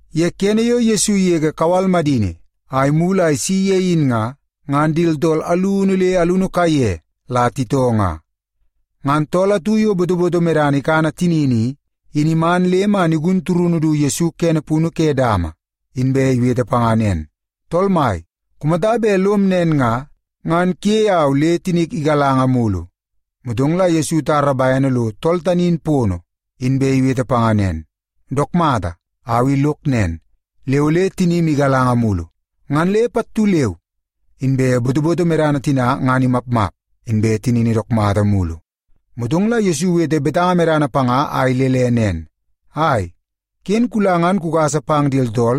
Ye kene yo Yesu igege kawal madini a imulu a isi ye in nga, ngan di tooltool alunu le alunu kaiye la titoo nga. Ngan tool atu yo botoboto medana ikana tinini i, in iman le man igun turunu du Yesu kene punu ke dama, inbe iwete panga nen, “Tool Mai, kumata bet lom nen nga, ngan kuyei au le tinik igalanga mulu.” Motong la Yesu itara bene lo tool tani in pono, inbe iwete panga nen, “Dook mata, au i lok nen, le ole tinim igalanga mulu.” Ngan le pattu leu inbe botoboto medana tina ngan imapmap, inbe tinini dook mata mulu. Motong la Yesu iwete betanga medana panga a ilele nen, “Ai, ken kula ngan kugasa pang di tooltool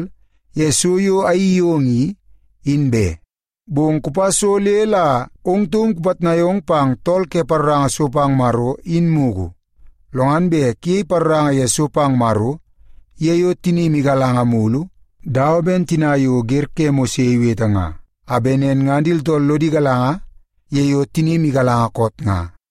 ye so yo ayeii yong i, in be. Bong kupa so le la ong taum kupitnai ong pang tool ke paroranga so pang Maro in mugu. Lo ngan bet kuyei paroranga ye so pang Maro ye yo tinim igalanga mulu, dawa ben tina yo wer ke Mose iwete nga, a bet nen ngan di tooltool lodi galanga ye yo tinim igalanga koot nga.”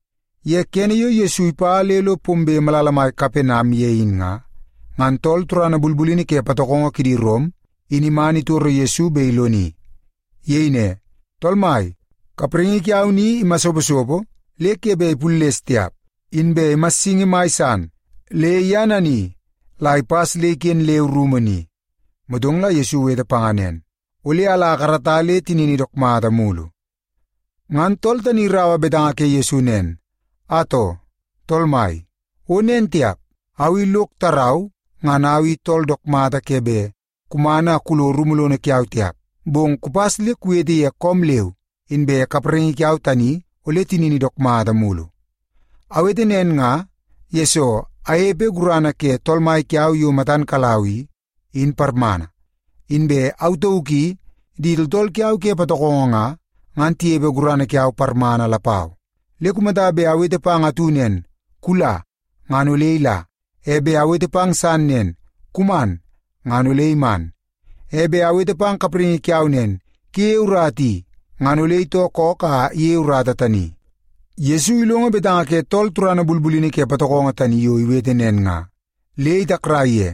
Ye kene yo Yesu ipa le lo pombe malala mai Kapenam ye in nga, ngan tool turana bulbulini ke patokongo kidi Rom, in man itoro Yesu bet iloni. Iyei ne, “Tool Mai, kapraingi kiau ni imasoposopo le ke bet ipulles tiap, inbe imassingi mai san le ye nani la ipas le iken leu rumu ni.” Motong la Yesu iwete panga nen, “Ole ala akarata le tinini dook mata mulu.” Ngan tool tani iraua betanga ke Yesu nen, “Atoo, Tool Mai, o nen tiap! Au i lok tarau ngan au i tool dook mata ke bet kuman a kulo rumu lono kiau tiap. Bong kupas le kuwete ye koom leu, inbe kapraingi kiau tani ole tinini dook mata mulu. Awete nen nga, yesoo anepe gurana ke tool mai kiau yo matan kalau i, in parmana. Inbe au tauk i di tooltool kiau ke patokongo nga, ngan tinepe gurana kiau parmana lapau. Le kumata bet awete pang atu nen, ‘Kula,’ ngan ole ila. E bet awete pang san nen, ‘Kuman,’ ngan ole iman. E bet awete pang kapraingi kiau nen, ‘Kuyeie urata i,’ ngan ole itoo kook a iyeie urata tani.” Yesu ilongo betanga ke tool turana bulbulini ke patokongo tani yo iwete nen nga, le itakrai ye.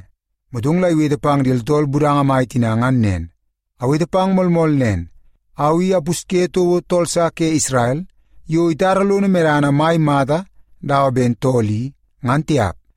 Motong la iwete pang di tooltool budanga mai tina ngan nen, “Awete pang moolmool nen, au i apusye toko tool sa ke Isrel yo itara lono medana mai mata dawa ben tool i, ngan tiap.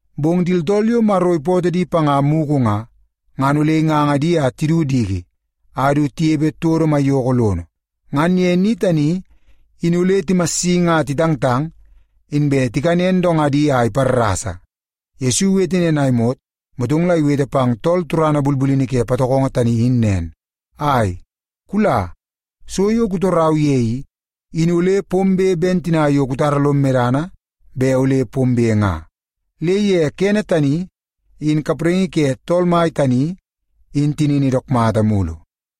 Bong di tooltool yo Maro ipootoo di panga mugu nga, ngan ole inganga di a tidu diki a du tinepe todo maiyoko lono. Ngan ye ni tani in ole timassingi a titangtang, inbe tikanen dongadi a iparrasa.” Yesu iwete nen a imot, motong la iwete pang tool turana bulbulini ke patokongo tani in nen, “Ai, kula. So yo kutorau ye i, in ole pombe ben tina yo kutara lom medana bet ole pombe nga.” Le ye kene tani, in kapraingi ke tool mai tani in tinini dook mata mulu.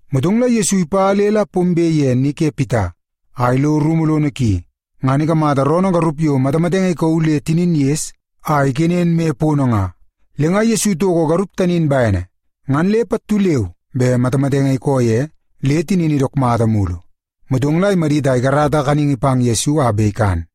Motong la Yesu ipa le la pombe ye ni ke Pita, a ilo rumu lono ki. Ngan ikamata Pita roonoo garup yo matamatenge ikauu le tinin ges a ikenen moi pono nga. Le nga Yesu itoko garup tani in bene, ngan le pattu leu be matamatenge ikoo ye le tinini dook mata mulu. Motong la imadit a ikarata kaningi pang Yesu a bet ikan.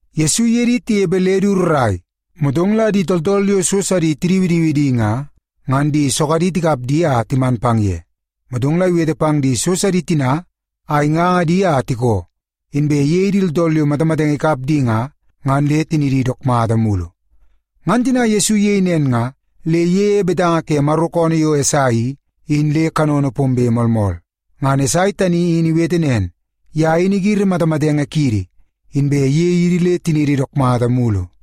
Yesu iye di tinepe le du rrai, motong la di tooltool yo so sidi tidiwidiwi di nga, ngan di sogadi tikap di a timan pang ye. Motong la iwete pang di so sidi tina a inganga di a tikoo, inbe iyei di tooltool yo matamatenge ikap di nga, ngan le tinidi dook mata mulu. Ngan tina Yesu iyei nen, le iyeie betanga ke Maro koonoo yo Esai i, in le kanono pombe moolmool. Ngan Esai tani in iwete nen, “Ye in igiri matamatenge kiidi, inbe iyei idi le tiniidi dook mata mulu.”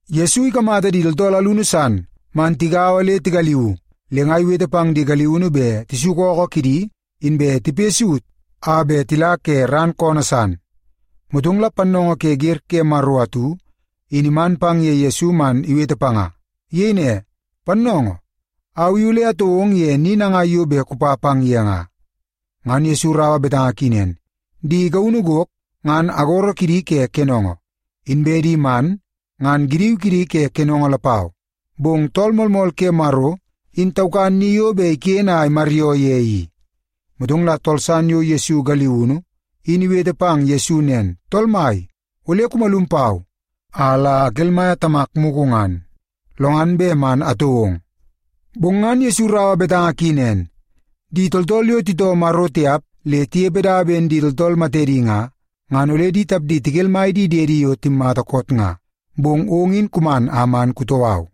Yesu ikamata di tooltool alunu san man tigaua le tigaliuu, le nga iwete pang di galiunu bet tisuku ookoo kidi inbe tipoi saut a bet tila ke ran koonoo san. Motong la pannoongoo ke wer ke Maro atu in iman pang ye Yesu man iwete panga. Iyei ne, “Pannoongoo, au i ole atoo ong ye ni nangai yo bet kupa pang ye nga.” Ngan Yesu iraua betanga ki nen, “Di gaunu gok ngan agoro kidi ke kenongo, inbe di man ngan giniu kidi ke kenongo lapau, bong Tool Moolmool ke Maro, in taukan ni yo bet iken a imaryoo ye i.” Motong la tool san yo Yesu galiunu, in iwete pang Yesu nen, “Tool mai, ole kumalum pau a la akelmaia tamak mugu ngan, lo ngan bet man atoo ong.” Bong ngan Yesu iraua betanga ki nen, “Di tooltool yo titoo Maro tiap le tinepe dawa ben di tooltool matedi nga, ngan ole di tapdi tikelmai di diedi yo timmata koot nga. Bong ong in kuman a man kutoo au.”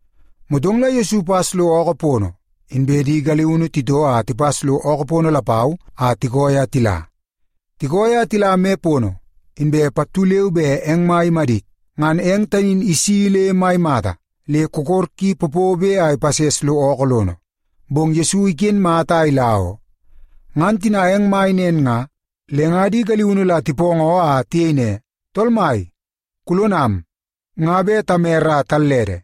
Motong la Yesu ipas lo ookoo pono, inbe di galiunu titoo a tipas lo ookoo pono lapau a tikooi a tila. Tikooi a tila me pono, inbe pattu leu be eng mai imadit. Ngan eng tani in isi le mai mata, le kokor ki popobe a ipases lo ookoo lono, bong Yesu iken mata a ila oo. Ngan tina eng mai nen nga, le nga di galiunu la tipoongoo a tiyei ne, “Tool Mai, kulonam! Nga bet tamere a tallede!”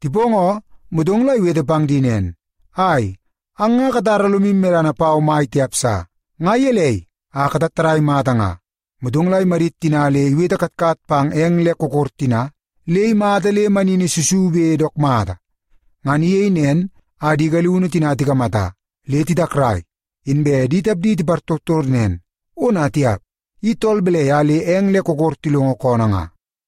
Tipoongoo, motong la iwete pang di nen, “Ai, ang nga katara lomu medana pau mai tiap sa. Nga gelei a katattadai mata nga?” Motong la imadit tina le iwete katkat pang eng le kokor tina, le imata le manini susube dook mata. Ngan iyei nen a di galiunu tina tikamata, le titakrai, inbe di tapdi tipartortor nen, “Ona tiap! I tool balai a le eng le kokor tilongo koonoo nga?”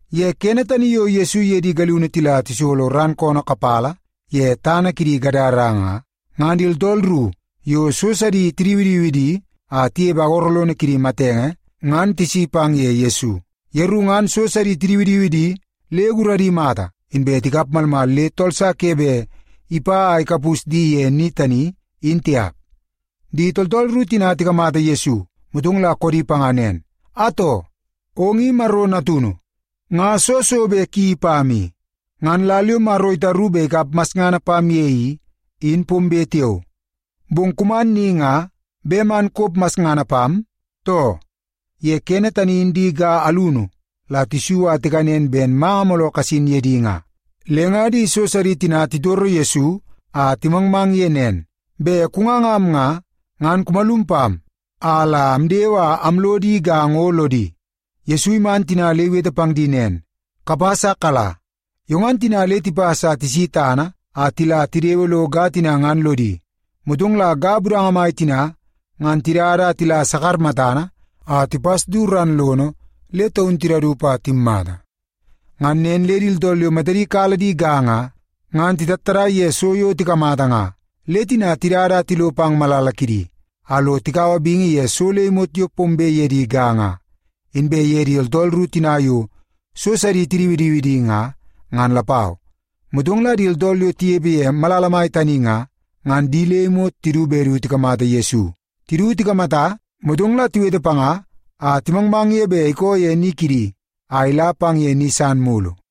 Ye kene tani yo Yesu iye di galiunu tila tisolo ran koonoo kapala ye tana kidi tooltool ke Gadara nga, ngan di tooltool ru yo so sidi tidiwidiwi di a tinepe agoro lono kidi matenge ngan tisi pang ye Yesu. Yeru ngan di so sidi tidiwidiwi di le guradi mata, inbe tikap malmal le tool sa ke bet ipa a ikapus di ye ni tani, in tiap. Di tooltool ru tina tikamata Yesu, motong koodi panga nen, “Atoo! Ong i Maro Natunu. Nga soo so bet kuyeii pam i? Ngan lal yo Maro itaru bet ikap masngana pam ye i, in pombe tiao, bong kuman ni nga bet man kop masngana pam, too?” Ye kene tani in di ga alunu la tisu a tikanen ben manga mooloo kasin ye di nga. Le nga di so sidi tina titoro Yesu a timangmang ye nen, “Bet kungangam nga, ngan kumalum pam a la amdewe a amlo di ga ngo lodi.” Yesu iman tina le iwete pang di nen, “Kapas a kala.” Yo ngan tina le tipas a tisi tana a tila tidewe lo ga tina ngan lodi. Motong la ga budanga tina ngan tidada a tila sakar matana a tipas du ran lono le taun tidaup a timmata. Ngan nen le di tooltool yo matadi kala di ga nga, ngan titattadai ye so yo tikamata nga. Le tina tidada a tilo pang malala kidi, a lo tikaua bingi ye so le imot yo pombe ye di ga nga, inbe ye di tooltool ru tina yo so sidi tidiwidiwi di nga, ngan lapau. Motong di tooltool yo tinepe ye malala mai tani nga, ngan di le imot tidu bet du tikamata Yesu. Tidu tikamata, motong la tiwete panga a timangmang ye bet ikoo ye ni kidi a ila pang ye ni san mulu.